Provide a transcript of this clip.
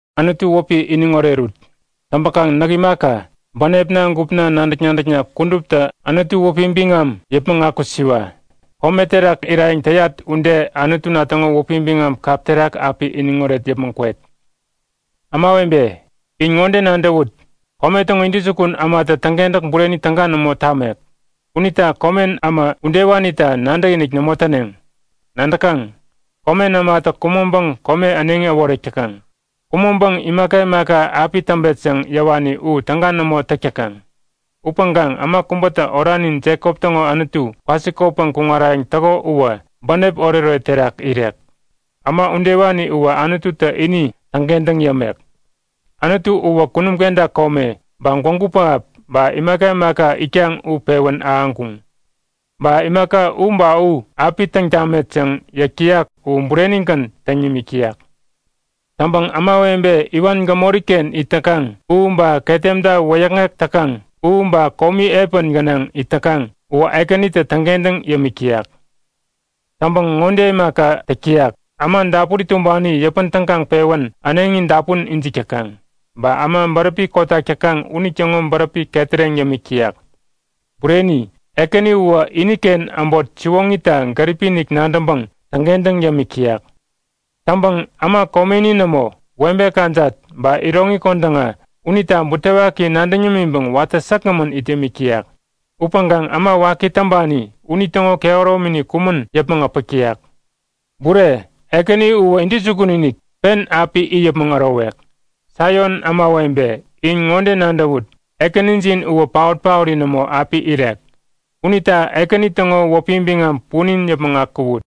Anutu wäpi iniŋ orerut! Täŋpäkaŋ näk imaka, bänepna gupna, nadäk-nadäkna kuduptä Anutu wäpi biŋam yäpmäŋ akusiwa! Kome terak irayäŋ täyat ude Anutuna täŋo wäpi biŋam kap terak api iniŋoret yäpmäŋ kwet. Ämawebe, in ŋode nadäwut; Kome täŋo intäjukun ämatä täŋkentäk bureni täga nämo tamek. Unita komen äma udewanita nadäkinik nämo täneŋ. Nadäkaŋ? Komen ämatä kumäŋpäŋ kome äneŋi äworek täkaŋ. Kumäŋpäŋ imaka imaka api täŋpet yäŋ yäwani u täga nämo täk täkaŋ. Upäŋkaŋ äma kubätä oranin Jekop täŋo Anutu kwasikotpäŋ kuŋarayäŋ täko uwä bänep oretoret terak irek. Äma udewani uwä Anututä ini täŋkentäŋ yämek. Anutu uwä kunum kenta kome, ba gwägu pähap ba imaka imaka itkaŋ u pewän ahäŋkuŋ. Ba imaka u ba u api täŋ tamet yäŋ yäk täyak u burenigän täŋ nimik täyak. Täŋpäŋ ämawebe iwan gämoriken it täkaŋ, u ba ketemta wäyäkŋek täkaŋ, u ba komi epän gänaŋ it täkaŋ uwä Ekänitä täŋkentäŋ yämik täyak. Täŋpäŋ ŋode imaka täk täyak; Äma dapuri tumbani yäpän tägaŋpewän äneŋi dapun ijik täkaŋ. Ba äma bäräpi kotak täkaŋ unitäŋo bäräpi ketäreŋ yämik täyak. Bureni! Ekäni uwä iniken äbot siwoŋita gäripi-inik nadäŋpäŋ täŋkentäŋ yämik täyak. Täŋpäŋ äma komeni nämo, webe kajat ba iroŋi kodäŋa unita butewaki nadäŋ yämiŋpäŋ watä säkgämän it yämik täyak. Upäŋkaŋ äma waki täŋpani unitäŋo kehäromini kumän yäpmäŋ äpäk täyak. Bureni! Ekäni uwä intäjukun-inik pen api it yäpmäŋ ärowek! Saion ämawebe, in ŋode nadäwut; Ekänijin uwä paot-paori nämo api irek. Unita Ekäni täŋo wäpi biŋam punin yäpmäŋ akuwut!